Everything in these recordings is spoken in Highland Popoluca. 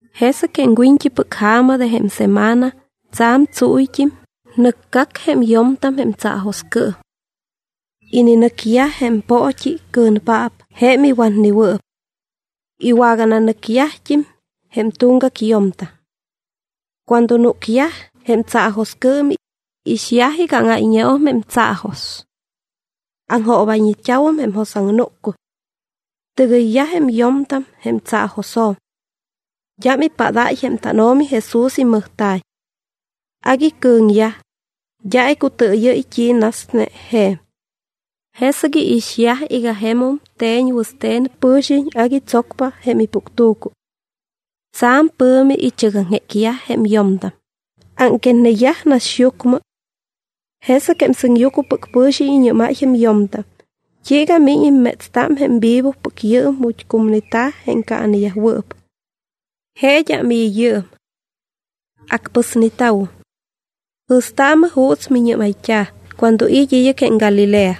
Jesɨc jém wiñt́ipɨc ja̱ma de jém semana, tsa̱m tsúyt́im, nɨcgac jém yo̱mtam jém tsaajoscɨɨm. Ininɨcyaj jém poot́i cɨ̱npaap jém iwatnewɨɨp. Iwagananɨcyajt́im jém tuŋgac yo̱mtam. Cuando núcyaj jém tsaajoscɨɨm, iixyaj iga áŋáyñeum jém tsaajos. Aŋjoobayñeta̱wum jém jos aŋnúccuy. Tɨgɨyyaj jém yo̱mtam jém tsaajosjo̱m. D́am ipádáy jém tánO̱mi Jesús imɨjta̱y. Agui cɨ̱ŋyaj, d́a icutɨɨyɨ́y t́i nasne je̱m. Jesɨc iixyaj iga jemum te̱ñ wɨste̱n pɨ̱xiñ, agui tsocpa jém ipuctu̱cu. Tsa̱m pɨ̱mi ichɨgaŋjécyaj jém yo̱mtam, ámquetneyaj naxyucmɨ. Jesɨc jém sɨŋyucmɨpɨc pɨ̱xiñ iñɨ́máy jém yo̱mtam: —¿T́iiga miñ immétsta jém vivopɨc yɨɨm ju̱t́ cumneta̱ jém caaneyajwɨɨp? Je d́am i̱ yɨɨm. Acpɨsneta̱wum. Jɨ̱staamɨ juuts miñɨ́mayt́a cuando it́ id́ɨc jém Galilea.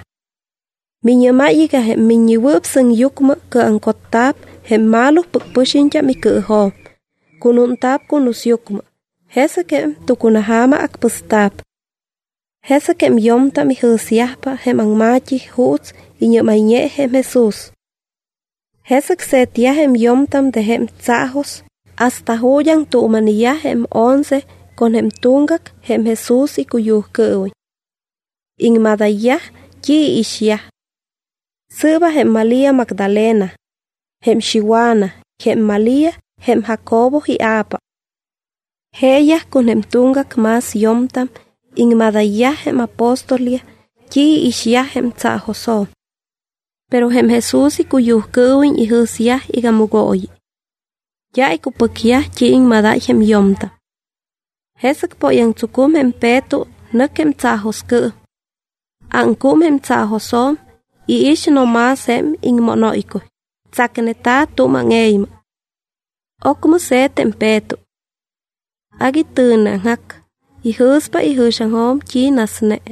Miñɨ́máy iga jém Miññewɨɨp Sɨŋyucmɨ cɨɨjuŋcotta̱p jém malopɨc pɨxiñt́am icɨɨjo̱m, cunúnta̱p cunusyucmɨ, jesɨc jém tucunaja̱ma acpɨsta̱p. Jesɨc jém yo̱mtam ijɨ̱syajpa jém aŋma̱t́i juuts iñɨ́mayñe jém Jesús. Jesɨc se̱tyaj jém yo̱mtam de jém tsaajos hasta ju̱t́ aŋtuuma̱neyaj jém once con jém tuŋgac jém Jesús icuyujcɨɨwiñ. Iŋmadayyaj t́i iixyaj. Sɨɨba jém Malía Magdalena, jém Xiwana y jém Malía jém Jacobo ia̱pa. Jeeyaj con jém tuŋgac más yo̱mtam iŋmadayyaj jém apóstolyaj t́i iixyaj jém tsaajosjo̱m. Pero jém Jesús icuyujcɨɨwiñ ijɨ̱syaj iga mɨgooyi. D́a icupɨcyaj t́i iŋmadáy jém yo̱mtam. Jesɨc póyaŋtsucum jém Peto, nɨc jém tsaajoscɨɨm. Ámcúm jém tsaajosjo̱m, iix no más jém iŋmónóycuy, tsacneta̱ tu̱m áŋe̱ymɨ. Ocmɨ se̱t jém Peto. Agui tɨ̱neaŋjac, ijɨ̱spa ijɨ̱xiaŋjo̱m t́i nasne.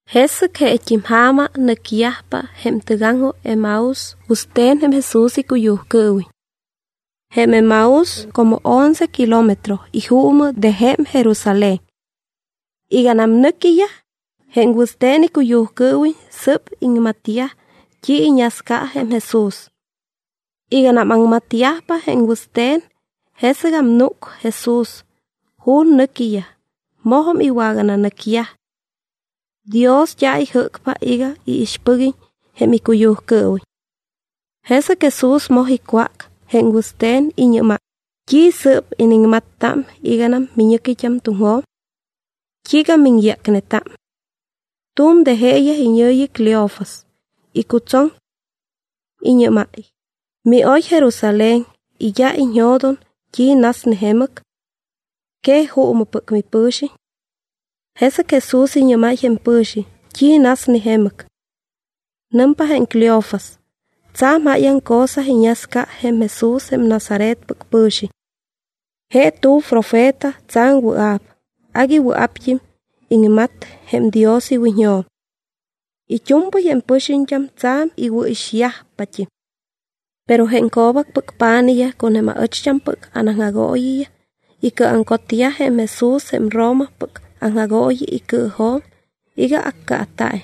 Jesɨc jeet́im ja̱ma nɨcyajpa jém tɨgaŋjoj Emaús wɨste̱n jém Jesús icuyujcɨɨwiñ. Jém Emaús como once kilómetro ijuumɨ de jém Jerusalén. Iganam nɨquiyaj jém wɨste̱n icuyujcɨɨwiñ, sɨ́p iŋmatyaj t́i iñasca jém Jesús. Iganam aŋmatyajpa jém wɨste̱n, jesɨgam núc Jesús ju̱t́ nɨquiyaj; mojum iwagananɨcyaj. Dios d́a ijɨ́cpa iga iixpɨguiñ jém icuyujcɨɨwiñ. Jesɨc Jesús moj icwác jém wɨste̱n, iñɨ́máy: —¿T́i sɨɨp iniŋmatta iganam miñɨquit́am tuŋjo̱m? ¿T́iiga miŋyácneta? Tu̱m de jeeyaj, iñɨ̱yi Cleofas, icutsoŋ. Iñɨ́máy: —¿Mioy Jerusalén y d́a iñjo̱doŋ t́i nasne jemɨc? ¿Que juumɨpɨc mipɨ̱xiñ? Jesɨc Jesús iñɨ́máy jém pɨ̱xiñ: —¿T́i nasne jemɨc? Nɨmpa jém Cleofas: —Tsa̱m jáyaŋ cosa iñasca jém Jesús jém Nazaretpɨc pɨ̱xiñ. Je tu̱m profeta tsa̱m wɨa̱p, agui wɨa̱pt́im iŋmat jém Dios iwiñjo̱m. It́u̱mpɨy jém pɨxiñt́am tsa̱m iwɨ̱ixyajpat́im. Pero jém co̱bacpɨc pa̱nijyaj con jém aɨcht́ampɨc anaŋjagooyiyaj icɨɨjuŋcotyaj jém Jesús jém Romapɨc aŋjagooyi icɨɨjo̱m iga accaata̱iñ.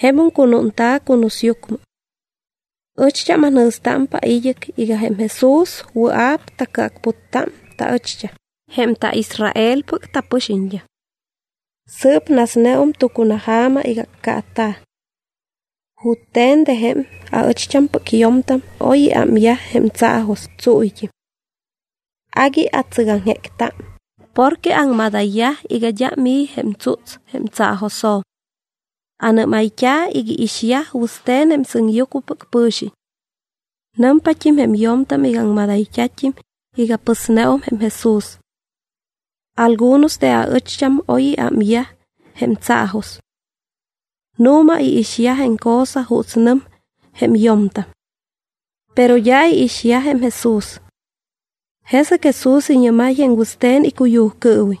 Jemum cunúnta̱ cunusyucmɨ. Ɨcht́am anjɨ̱stámpa id́ɨc iga jém Jesús wɨa̱p tacɨacputta taɨcht́am jém taIsraelpɨc tapɨxiñt́am. Sɨɨp nasneum tucunaja̱ma iga accaata̱. Jute̱n de jém aɨcht́ampɨc yo̱mtam oy iámyaj jém tsaajos tsúyt́im. Agui atsɨgaŋjécta, porque aŋmadayyaj iga d́am i̱ jém tsúts jém tsaajosjo̱m. Anɨ́mayt́a iga iixyaj wɨste̱n sɨŋyucmɨpɨc pɨ̱xiñ. Nɨmpat́im jém yo̱mtam iga aŋmadayt́a̱t́im iga pɨsneum jém Jesús. Algunos de aɨcht́am oy iámyaj jém tsaajos. Nu̱ma iixyaj jém cosa juuts nɨm jém yo̱mtam. Pero d́a iixyaj jém Jesús. Jesɨc Jesús iñɨ́máy jém wɨste̱n icuyujcɨɨwiñ: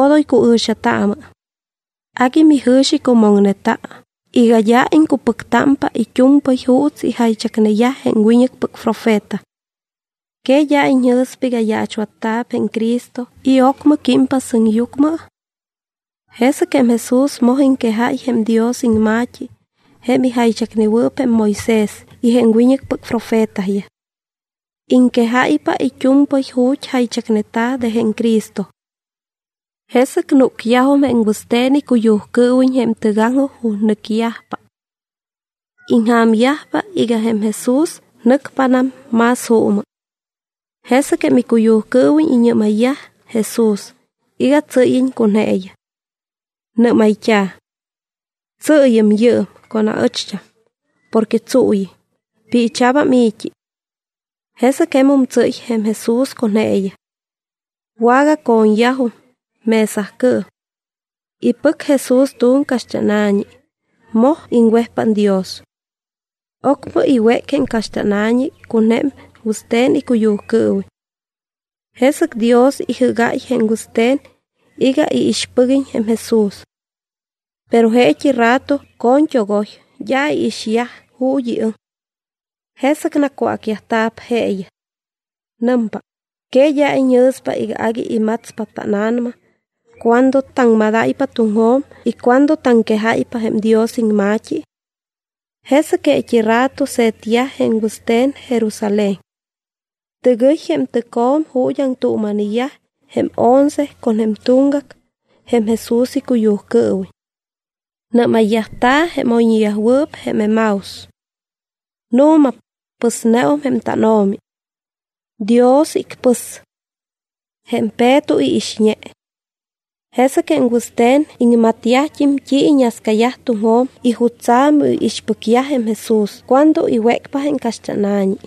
—Odoy cuɨ̱xataamɨ. Agui mijɨ̱xicumoŋneta iga d́a iŋcupɨctámpa it́u̱mpɨy juuts ijaychacneyaj jém wiñɨcpɨc profeta. ¿Que d́a iñjɨ̱spa iga yaachwatta̱p jém Cristo y ocmɨ químpa sɨŋyucmɨ? Jesɨc jém Jesús moj iŋquejáy jém Dios iŋma̱t́i jém ijaychacnewɨɨp jém Moisés y jém wiñɨcpɨc profetayaj. Iŋquejáypa it́u̱mpɨy ju̱t́ jaychacneta̱ de jém Cristo. Jesɨc núcyajum jém wɨste̱n icuyujcɨɨwiñ jém tɨgaŋjoj ju̱t́ nɨcyajpa. Iŋja̱myajpa iga jém Jesús nɨcpanam más juumɨ. Jesɨc jém icuyujcɨɨwiñ iñɨ́mayyaj Jesús iga tsɨ́yiñ con jeeyaj. Nɨ́mayt́a̱: —Tsɨɨyɨm yɨɨm con aɨcht́am porque tsuuyɨm, piicha̱bam i̱t́i. Jesɨc jemum tsɨ́y jém Jesús con jeeyaj. Wagaco̱ñyajum mesacɨɨm. Ipɨc Jesús tu̱m caxt́ána̱ñi, moj iŋwejpát Dios. Ocmɨ iwéc jém caxt́ána̱ñi con jém wɨste̱n icuyujcɨɨwiñ. Jesɨc Dios ijɨ́gáy jém wɨste̱n iga iixpɨguiñ jém Jesús. Pero jeet́i rato coñt́ogoy, d́a iixyaj ju̱t́ iɨŋ. Jesɨc nacwácyajta̱p jeeyaj. Nɨmpa: —¿Que d́a iñjɨ̱spa iga agui imatspa tána̱nama cuando taŋmadáypa tuŋjo̱m y cuando taŋquejáypa jém Dios iŋma̱t́i? Jesɨc jeet́i rato se̱tyaj jém wɨste̱n Jerusalén. Tɨgɨy jém tɨcjo̱m ju̱t́ aŋtuuma̱neyaj jém once con jém tuŋgac jém Jesús icuyujcɨɨwiñ. Nɨ́mayyajta̱ jém oyñewɨɨp jém Emaús. —Nu̱ma, pɨsneum jém tánO̱mi. Dios icpɨs. Jém Peto iixñe. Jesɨc jém wɨste̱n iŋmatyajt́im t́i iñascayaj tuŋjo̱m y jutsa̱ miixpɨcyaj jém Jesús cuando iwécpa jém caxt́ána̱ñi.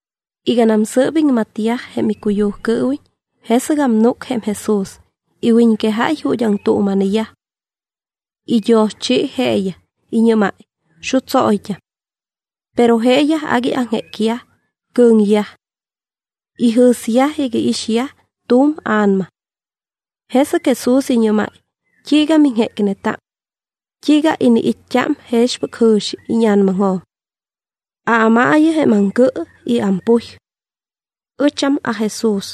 Iganam sɨ́p iŋmatyaj jém icuyujcɨɨwiñ, jesɨgam núc jém Jesús, iwiñquejáy ju̱t́ aŋtuuma̱neyaj. Idioschi jeeyaj, iñɨ́máy: —Xutsóyt́am. Pero jeeyaj agui aŋjécyaj, cɨ̱ŋyaj. Ijɨ̱syaj iga iixyaj tu̱m a̱nama. Jesɨc Jesús iñɨ́máy: —¿T́iiga miŋjécneta? ¿T́iiga iniit́t́a jexpɨc jɨ̱xi íña̱namaŋjo̱m? Aámaayɨ jém aŋcɨ y ampuy. Ɨcham aJesús.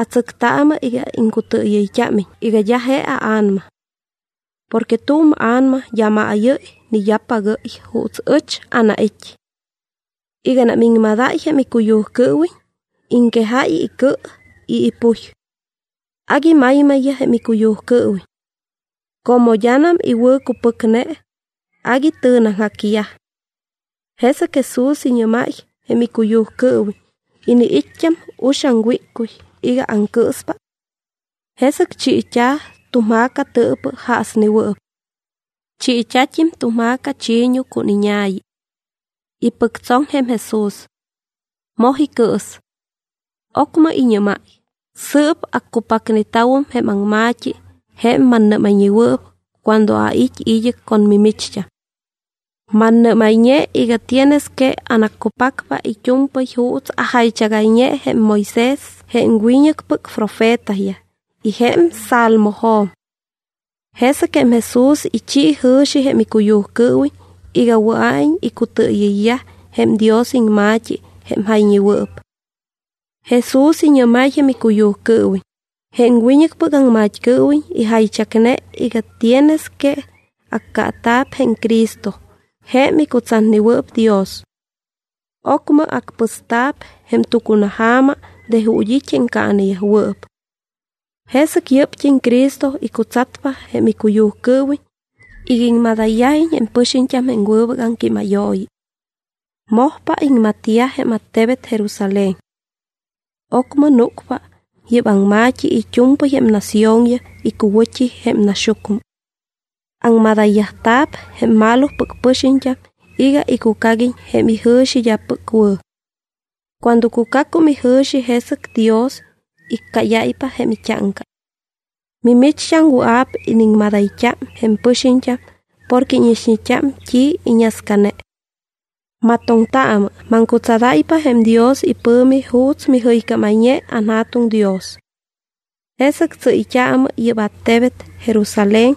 Atsɨctaamɨ iga iŋcutɨɨyɨyt́ámiñ iga d́a je aa̱nama. Porque tu̱m a̱nama d́a maayɨ́y ni d́a pagɨ́y juuts ɨch anait́. Iganam iŋmadáy jém icuyujcɨɨwiñ, iŋquejáy icɨ y ipuy. Agui maymayyaj jém icuyujcɨɨwiñ. Como d́anam iwɨ̱cupɨcne, agui tɨ̱neaŋjacyaj. Jesɨc Jesús iñɨ́máy jém icuyujcɨɨwiñ: —¿Iniit́t́a uxaŋ wíccuy iga aŋcɨɨspa? Jesɨc chiit́a̱ tu̱m ja̱ca tɨɨpɨ jaasnewɨɨp. Chiit́a̱t́im tu̱m ja̱ca chi̱ñu con iña̱yi. Ipɨctsoŋ jém Jesús. Moj icɨɨs. Ocmɨ iñɨ́máy: —Sɨɨp accupacneta̱wum jém aŋma̱t́i jém mannɨ́mayñewɨɨp cuando ait́ id́ɨc con mimicht́am. Mannɨ́mayñe iga tienes que anaccupacpa it́u̱mpɨy juuts ajaychagayñe jém Moisés, jém wiñɨcpɨc profetayaj y jém Salmojo̱m. Jesɨc jém Jesús ichi jɨ̱xi jém icuyujcɨɨwiñ iga wɨa̱iñ icutɨɨyɨyyaj jém Dios iŋma̱t́i jém jayñewɨɨp. Jesús iñɨ́máy jém icuyujcɨɨwiñ: —Jém wiñɨcpɨc aŋmat́cɨɨwiñ ijaychacne iga tienes que accaata̱p jém Cristo jém icutsatnewɨɨp Dios. Ocmɨ acpɨsta̱p jém tucunaja̱ma de ju̱t́ it́ jém caaneyajwɨɨp. Jesɨc yɨ́pt́im Cristo icutsatpa jém icuyujcɨɨwiñ iga iŋmadayyajiñ jém pɨxiñt́am jém wɨbɨc aŋquímayooyi. Mojpa iŋmatyaj jém attebet Jerusalén. Ocmɨ núcpa yɨ́p aŋma̱t́i it́u̱mpɨy jém naciónyaj icuwɨ̱t́i jém naxyucmɨ. Aŋmadayyajta̱p jém malopɨc pɨxiñt́am iga icucaguiñ jém ijɨ̱xi d́apɨc wɨ̱. Cuando cucacum ijɨ̱xi, jesɨc Dios iccáyáypa jém it́áŋca. Mimicht́am wɨa̱p iniŋmadayt́a jém pɨxiñt́am porque íñixñeta t́i annascane. ¡Matoŋtaamɨ! Maŋcutsadáypa jém Dios ipɨ̱mi juuts mijɨycámayñe anJa̱tuŋ Dios. Jesɨc tsɨ́yt́aamɨ yɨ́p attebet Jerusalén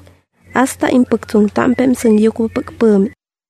hasta impɨctsoŋtámpa jém sɨŋyucmɨpɨc pɨ̱mi.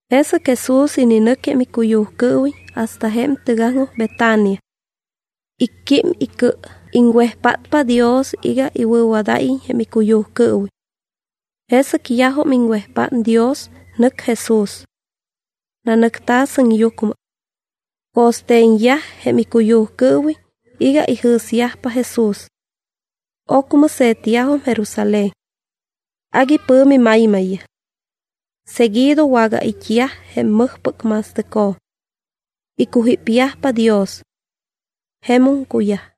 Jesɨc Jesús ininɨc jém icuyujcɨɨwiñ hasta jém tɨgaŋjoj Betania. Icquím icɨ, iŋwejpátpa Dios iga iwɨ̱wadáyiñ jém icuyujcɨɨwiñ. Jesɨc yajum iŋwejpát Dios, nɨc Jesús. Nanɨcta̱ sɨŋyucmɨ. Co̱ste̱ñyaj jém icuyujcɨɨwiñ iga ijɨ̱syajpa Jesús. Ocmɨ se̱tyajum Jerusalén. Agui pɨ̱mi maymayyaj. Seguido wagait́yaj jém mɨjpɨc ma̱stɨcjo̱m. Icujípyajpa Dios. Jemum cuyaj.